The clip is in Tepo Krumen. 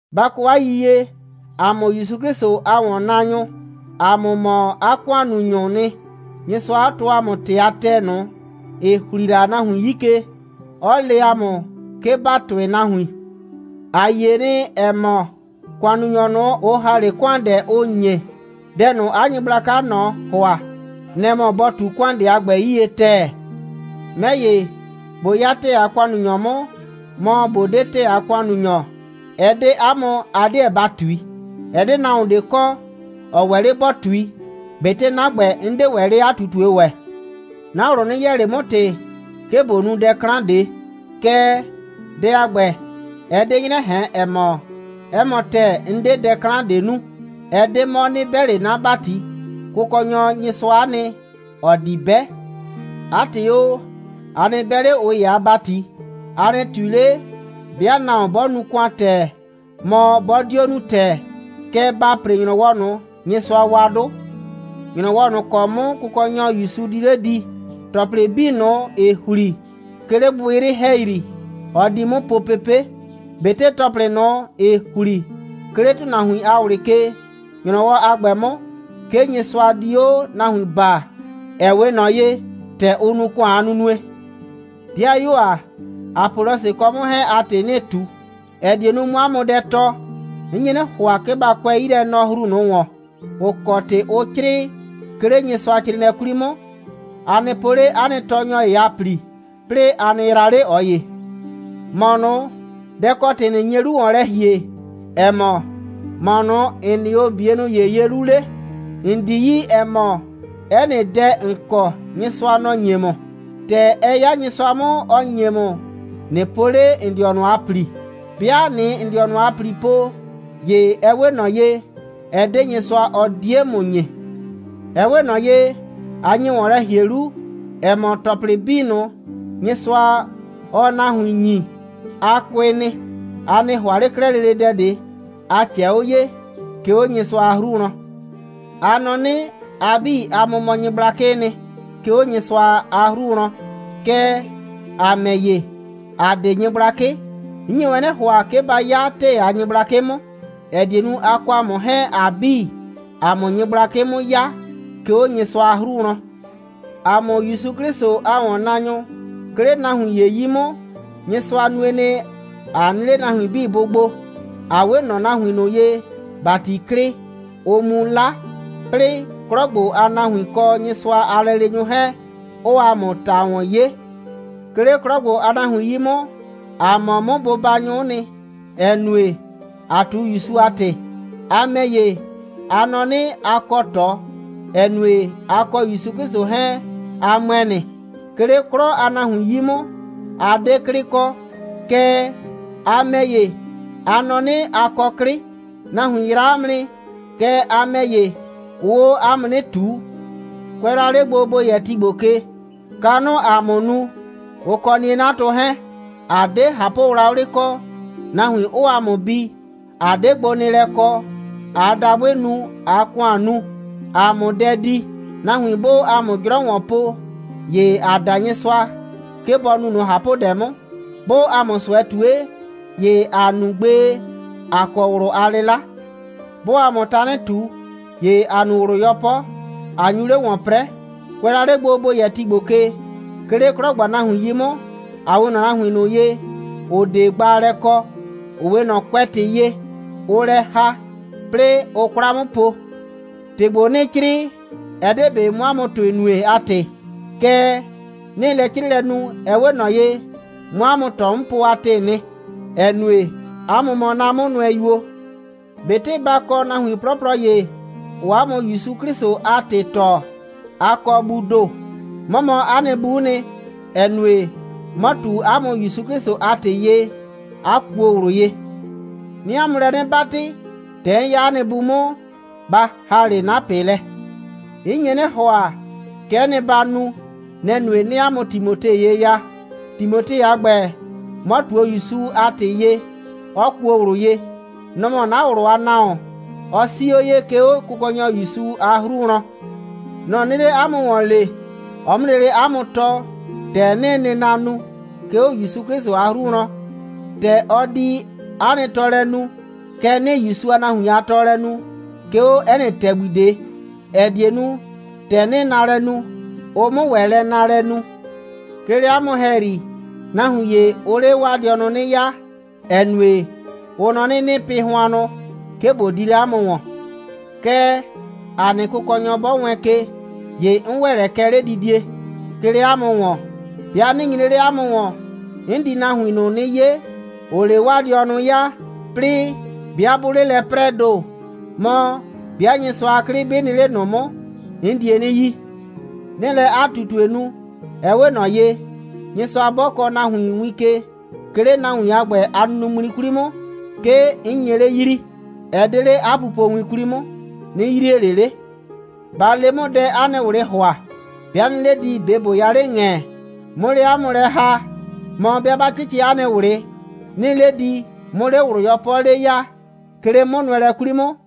Ba kɔ 'a yiyie, ‑a mʋ ‑Yusu 'Klɩsʋ a ‑wɔnnaanyʋ, ‑a mʋ mɔ 'a ‑kʋannunyʋʋ nɩ, Nyɩsʋa 'ɔ tɔɔ ‑a mʋ ‑tɩ a ‑tɛɛ ꞊nʋ, ‑ɩ ‑hli la nahuin 'yi ke, 'ɔ le ‑a mʋ, 'ke ‑ba tʋɩ nahuin. ‑A yie nɩ, ‑ɛ mɔ, ‑kʋannunyɔ ꞊nʋ, ʋ ‑ha 'le ‑kʋandɛ, ʋ ‑nye, dɛ ꞊nʋ, 'a nyɩgblakaa ꞊nɔ ‑hʋa, nɛ‑ mɔ bɔ ꞊tu ‑kʋandɛ a ‑gbɛ 'yie ‑tɛɛ. 'Mɛ ‑ye, ꞊bo 'ya ‑tɛɛ a ‑kʋannunyɔ 'mʋ, mɔ ꞊bo 'de ‑tɛɛ a ‑kʋannunyɔ, ɛ 'de 'a mʋ, a 'deɛ ba ꞊tui. Ɛ 'de nahuon ꞊de kɔ, ‑ɔ ‑wɛ 'le ‑bɔ ꞊tui. ꞊Betɩ 'na ‑gbɛ, 'n 'de ‑wɛ 'le 'a ꞊tutue ‑wɛ. 'Na ꞊wlʋ 'nɩ yɛɛ ꞊le 'mʋ ‑tɩ, 'ke ꞊bo nu dɛ 'klan ꞊de. Kɛɛ, dɛ a ‑gbɛ, ɛ 'de 'nyrɛ ꞊hɛn, ‑ɛ mɔ, 'ɛ mɔ ‑tɛɛ, 'n 'de dɛ 'klan ꞊de nu. Ɛ 'de 'mɔ, 'nɩ 'bɛ ꞊le 'na ‑bati. Kʋkɔnyɔ Nyɩsʋa'a nɩ, ‑ɔ di 'bɛ. 'A ‑tɩ o, a nɩ 'bɛ 'le ꞊ʋ ‑ye a ‑bati, a nɩ ꞊tui 'le, 'bɩa nahuon 'bɔ nu ‑kʋan ‑tɛɛ, mɔ, 'bɔ 'dio nu ‑tɛɛ. Kɛɛ, ba ‑pre ‑nyrɔwɔ ꞊nʋ, Nyɩsʋa wa 'dʋ. ‑Nyrɔwɔ ꞊nʋ ‑kɔ 'mʋ Kʋkɔnyɔ ‑Yusu di 'le di, ‑tɔplɩ 'bii ꞊nʋ, ‑ɩ ‑hli, 'ke 'le gbɩgbɩyrɩ ‑hɛyri, ɔ di 'mʋ po pepe', ꞊betɩ ‑tɔplɩ ꞊nʋ, ‑ɩ ‑hli, 'ke 'le ‑tʋnahuin a ꞊wlɩ ke. ‑Nyrɔwɔ a ‑gbɛ 'mʋ, 'ke Nyɩsʋa di 'o nahuin baa, ‑ɛ 'we ꞊nɔ ye, ‑tɛ ʋ nu ‑kʋan a nunue. 'Dɩayuo ‑a, Apɔlɔsɩ kɔ 'mʋ 'hɛɛn a ‑tɩ 'nɩɩ ꞊tu, ‑ɛ die nu, 'mʋ 'a mʋ dɛ tɔɔ. 'N nye 'nɩ ‑hʋa, 'ke ba kʋɛ 'yilɛnɔhru ꞊nʋ ‑wɔn, ‑ʋ kɔ ‑tɩ ʋ 'crɩɩ, 'ke 'le Nyɩsʋacrɩɩnɩɛ 'kwli 'mʋ. A nɩ po 'le 'a nɩ tɔɔnyɔ ‑ye a ‑pli, 'plɩɩ a nɩ yraa 'le ꞊ɔ ‑ye. ‑Mɔ ꞊nʋ, dɛ‑ kɔ ‑tɩ ꞊nɩ nye 'lu ‑wɔn lɛ ‑hie, ‑ɛ mɔ, ‑mɔ ꞊nʋ, ‑n nɩ 'o ‑n 'bienʋ ‑ye ye 'lu 'le? ‑N 'di 'yi, ‑ɛ mɔ, 'ɛ nɩ dɛ, ‑n kɔ, Nyɩsʋa, nɔ‑ ‑nye ‑mʋ. ‑Tɛ ɛ 'ya Nyɩsʋa 'mʋ, ‑ɔ ‑nye ‑mʋ, ꞊nɩ po 'le ‑n dɩɔnʋ a ‑pli. 'Bɩa ꞊nɩɩ ‑n dɩɔnʋ a ‑pli po, ‑ye ɛ 'we ꞊nɔ ye, ɛ 'de Nyɩsʋa, ɔ 'die ‑mʋ ‑nyi. Ɛ 'we ꞊nɔ ye, a nye ‑wɔn lɛ ‑hie 'lu, ‑ɛ mɔ, ‑tɔplɩ 'bii ꞊nʋ, Nyɩsʋa, ɔɔ nahuin ‑nyi, a kʋɩ nɩ. A 'nɩ ‑hʋa ꞊le 'klɛɛ lele dɛ ꞊de, 'a ꞊cɛɛ 'o ye, 'ke 'o Nyɩsʋa a 'hru wlɔn. A nɔ 'nɩ, a 'bii, 'a mʋ mɔ nyɩgblakɩɩ nɩ, 'ke 'o Nyɩsʋa a 'hru wlɔn. Kɛɛ, ‑a ‑mɛ ‑ye, ‑a 'de nyɩgblakɩ. 'N nye wɛn 'nɩ ‑hʋa, 'ke ba 'ya ‑tɛɛ a nyɩgblakɩ 'mʋ, ‑ɛ die nu, a kɔ ‑a mʋ 'hɛɛn, ‑a 'bii, ‑a 'mʋ nyɩgblakɩ 'mʋ 'ya, 'ke 'o Nyɩsʋa a 'hru wlɔn. ‑A mʋ ‑Yusu 'Klɩsʋ a ‑wɔnnaanyʋ, 'ke 'le nahuin ‑ye 'yi 'mʋ, Nyɩsʋa nue nɩ, ꞊a nɩ 'le nahuin 'bii bʋ gbo, ꞊a 'we ꞊nɔ nahuin ꞊nʋ ye, ‑bati klɩ, ʋʋ mu 'la, 'plɩɩ 'klɔ ‑gbo a nahuin kɔ Nyɩsʋa a lɛleenyʋ 'hɛɛn, 'ʋʋ ‑a mʋ ‑ta ‑wɔn 'ye. 'Ke 'le 'klɔ a nahuin 'yi 'mʋ, ‑a mɔ mʋ bʋbanyʋ'ʋ nɩ, ‑ɛ nue, ‑aa ꞊tu ‑Yusu a ‑tɩ. A ‑mɛ ‑ye, a nɔ 'nɩ, a kɔ ꞊tɔ, ‑ɛ nue, a kɔ ‑Yusu 'Klɩsʋ 'hɛɛn, a ‑mʋɛ nɩ. 'Ke 'le 'klɔ a nahuin 'yi 'mʋ, ‑a 'de 'klɩ kɔ. Kɛɛ, a ‑mɛ ‑ye, a nɔ 'nɩ, a kɔ 'klɩ. Nahuin yraa ‑a mʋ nɩ. Kɛɛ, a ‑mɛ ‑ye, ʋʋ 'o 'a mʋ 'nɩ ꞊tuu. Kʋɛ la 'le gbo, ‑bo yɛ ti ‑gbo ke, kanʋʋ ‑a mʋ nu, ʋ kɔ 'nie'natʋ 'hɛɛn. ‑A 'de ꞊hapʋwlawlɩ kɔ, nahuin 'ʋʋ ‑a mʋ bi, ꞊a 'de gbonɩɩlɛ kɔ, ꞊aa dabʋɩ nu, ꞊aa ‑kʋan nu, ‑a 'mʋ dɛ di. Nahuin 'bʋʋ ‑a mʋ 'jrɔ ‑wɔn po, ‑ye ‑aa da Nyɩsʋa, 'ke bɔ nu ꞊nʋ ꞊hapʋdɛ 'mʋ. 'Bʋʋ ‑a mʋ ꞊sʋɛ ꞊tue, ‑ye ‑aa nu gbee, ꞊a kɔ ꞊wlʋ a 'lɩla. 'Bʋʋ ‑a mʋ tanɩ ꞊tu, ‑ye ‑a nu ꞊wlʋ 'yɔpɔ, ꞊a nyu 'le ‑wɔn 'prɛɛ. Kʋɛ la 'le gbo, ‑bo yɛ ti ‑gbo ke, 'ke 'le 'klɔ ‑gbo a nahuin 'yi 'mʋ, ‑a 'we ꞊nɔ nahuin ꞊nʋ ye, ‑ʋ 'de gbaalɛ kɔ, ‑ʋ 'we ꞊nɔ kʋɛtɩ ye, ʋʋ lɛ ‑ha, 'plɩɩ ʋʋ 'kwla 'mʋ po. ‑Tɩ ‑gbo, 'nɩɩ 'crɩɩ, ɛ 'de ꞊be 'mʋ 'a mʋ ‑tʋɩ nue a ‑tɩ. Kɛɛ, 'nɩɩ lɛ 'crɩɩlɛ nu, ɛ 'we ꞊nɔ ye, 'mʋ 'a mʋ ꞊tɔ 'mʋ po a ‑tɩɩ nɩ, ‑ɛ nue, 'a mʋ mɔ 'na 'mʋnʋɛyuo. ꞊Betɩ ba kɔ nahuin 'plɔplɔ ‑ye, ‑ʋʋ 'a mʋ ‑Yusu 'Klɩsʋ a ‑tɩ tɔɔ, a kɔ buu ‑do. 'Mɔ mɔ 'a nɩ bu'u nɩ, ‑ɛ nue, 'mɔ ꞊tu 'a mʋ ‑Yusu 'Klɩsʋ a ‑tɩ ye, 'a kuo ꞊wlʋ ye. 'Nɩɩ 'a mʋ lɛ 'nɩ 'batɩ, ‑tɛ 'n 'ya 'a nɩ bu 'mʋ, ba ‑ha 'le 'na ꞊pɩ lɛ. 'N nye 'nɩ ‑hʋa, kɛ'ɛ nɩ, ba nu. Nɛ‑ nue, 'nɩɩ 'a mʋ Timote ye ya. Timote a ‑gbɛ, 'mɔ ꞊tuo ‑Yusu a ‑tɩ ye, 'ɔ kuo ꞊wlʋ ye. Nɔ‑ mɔ 'na ꞊wlʋ a nahuon. Ɔ 'sii 'o ye, 'ke 'o Kʋkɔnyɔ ‑Yusu a 'hru wlɔn. Nɔ‑ 'nɩɩ 'le 'a mʋ ‑wɔn lee, ɔ 'mʋ lele 'a mʋ tɔɔ, ‑tɛ 'nɩɩ nɩna nu, 'ke 'o ‑Yusu 'Klɩsʋ a 'hru wlɔn. ‑Tɛ ɔ di 'a nɩ tɔɔlɛ nu, kɛ 'nɩɩ ‑Yusu a nahuin a tɔɔlɛ nu, 'ke 'o 'ɛ nɩ ‑tɛgbi ꞊de, ‑ɛ die nu, ‑tɛ 'nɩɩ naalɛ nu, ʋ 'mʋ ‑wɛ lɛ naalɛ nu. 'Ke 'le 'a mʋ ‑hɛyri, nahuin ‑ye, ʋʋ 'le 'waa dɩɔnʋ 'nɩ 'yaa, ‑ɛ nue, ʋ nɔ 'nɩ, 'nɩɩ pɩ hʋannʋ, 'ke ꞊bo di 'le 'a mʋ ‑wɔn. Kɛɛ, ‑a nɩ Kʋkɔnyɔ, 'bɔ wɛɛn ke, ‑ye 'n ‑wɛ lɛ kɛ 'ledidie, 'ke 'le 'a mʋ ‑wɔn. 'Bɩa 'nɩ nyre 'le 'a mʋ ‑wɔn, 'n di nahuin ꞊nʋ 'nɩ 'ye, ‑ʋʋ 'le 'waa dɩɔnʋ 'yaa, 'plɩɩ 'bɩa 'bʋʋ 'le lɛ 'prɛɛ ‑do, mɔ, 'bɩa Nyɩsʋa a 'klɩ 'bɩ nɩ 'le ꞊nʋ 'mʋ, 'n die 'nɩ yi. 'Nɩɩ lɛ 'a ꞊tutue nu, ɛ 'we ꞊nɔ ye, Nyɩsʋa 'bɔ kɔɔ nahuon win ke, 'ke 'le nahuon a ‑gbɛ a nunuŋmli 'kwli 'mʋ, 'ke ‑n nye 'le yrii. Ɛ 'de 'le 'a pupowin 'kwli 'mʋ, ꞊nɩ yrie ꞊le 'le. Ba le 'mʋ, dɛ 'a nɩ ꞊wlɩɩ ‑hʋa. 'Bɩa 'nɩɩ 'le di, ꞊be ꞊bo ya 'le ‑ŋɛ, 'mʋ 'le 'a mʋ lɛ ‑ha, mɔ, 'bɩa 'ba 'cɩcɩ 'a nɩ ꞊wlɩ, 'nɩɩ 'le di, 'mʋ 'le ꞊wlʋ 'yɔpɔ 'le ya, 'ke 'le 'mʋnʋɛlɛ 'kwli 'mʋ?